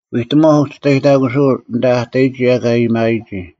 ᐎᑎᒺᐧᒄ ᐅᒋᔅᑕᔨᑕᑯᓱᐅᓐ ᐊᓐᑕ ᐊ ᑕᔨᒋ ᐊᑲ ᐊᔭᒥᐊᔨᒋ,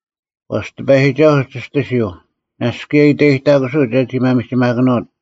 ᐛᔅ ᑎᐸᔨᒋᒐᓱᐤ ᒋᔅᑎᓯᐤ, ᓇᔅᒡ ᑭᔭ ᐃᑕᔨᑕᑯᓱᐤ ᒐᒋ ᒪᒥᒋᒪᑭᓄᐅᑦ;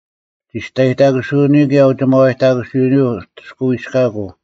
ᒋᔅᑕᔨᑕᑯᓱᐅᓂᔪᐤ ᑭᔭ ᐅᒋᒪᐛᔨᑕᑯᓱᐅᓂᔪᐤ ᐅᑎᔅᑲᐎᔅᑲᑯᐤ: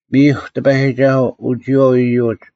ᒥᔨᐧᒄ ᑎᐸᔨᒋᒐᓱᐤ, ᐅ ᒋᔨᐛᐤ ᐃᔪᒡ,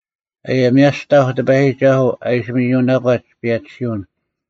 ᐅᐊᔭᒥᐊᔅᑕᐧᒄ ᑎᐸᔨᒋᒐᓱᐤ ᐊ ᐃᓯ ᒥᔪᓇᒂᒡ ᐸᔭᒋᓯᐅᓐ: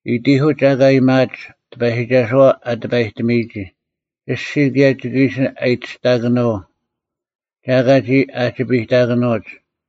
ᐃᑎᐧᑯᒡ ᐊᑲ ᐊᔭᒥᐊᒡ, “ᑎᐸᔨᒋᒐᓱᐛ ᐊ ᑎᐸᔨᒋᒐᔨᒋ᙮” ᐊᔅᒋᔾ ᑭᔭ ᒋᑭ ᐃᓯ ᐊᔨᑎᔅᑕᑭᓄᐤ; ᒐ ᐊᑲ ᒋ ᐊᒋᐱᔨᑕᑭᓂᐅᒡ: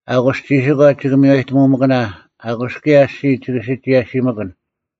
ᐊᑯᔅ ᒋᓯᒂ ᒋᑭ ᒥᔽᑕᒧᒪᑭᓇ, ᐊᑯᔅ ᑭᔭ ᐊᔅᒋᔾ ᒋᑭ ᓯᒋᔭᓯᒥᑭᓐ;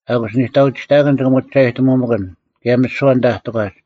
ᐊᑯᔅ ᓂᑕᐅᒋᑕᑭᓐ ᒋᑭ ᒧᒋᒐᔨᑎᒧᒥᑭᓐ, ᑭᔭ ᒥᓯᐛ ᐊᓐᑕ ᐊ ᑎᒂᒡ: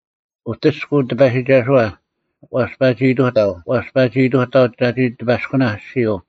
ᐅᑎᔅᑯᐤ ᑎᐸᔨᒋᒐᓱᐛ; ᐛᔅ ᐸᒋ ᐃᑐᑕᐤ, ᐛᔅ ᐸᒋ ᐃᑐᑕᐤ ᒐᒋ ᑎᐸᔅᑯᓇᐧᒃ ᐊᔅᒋᔪᐤ;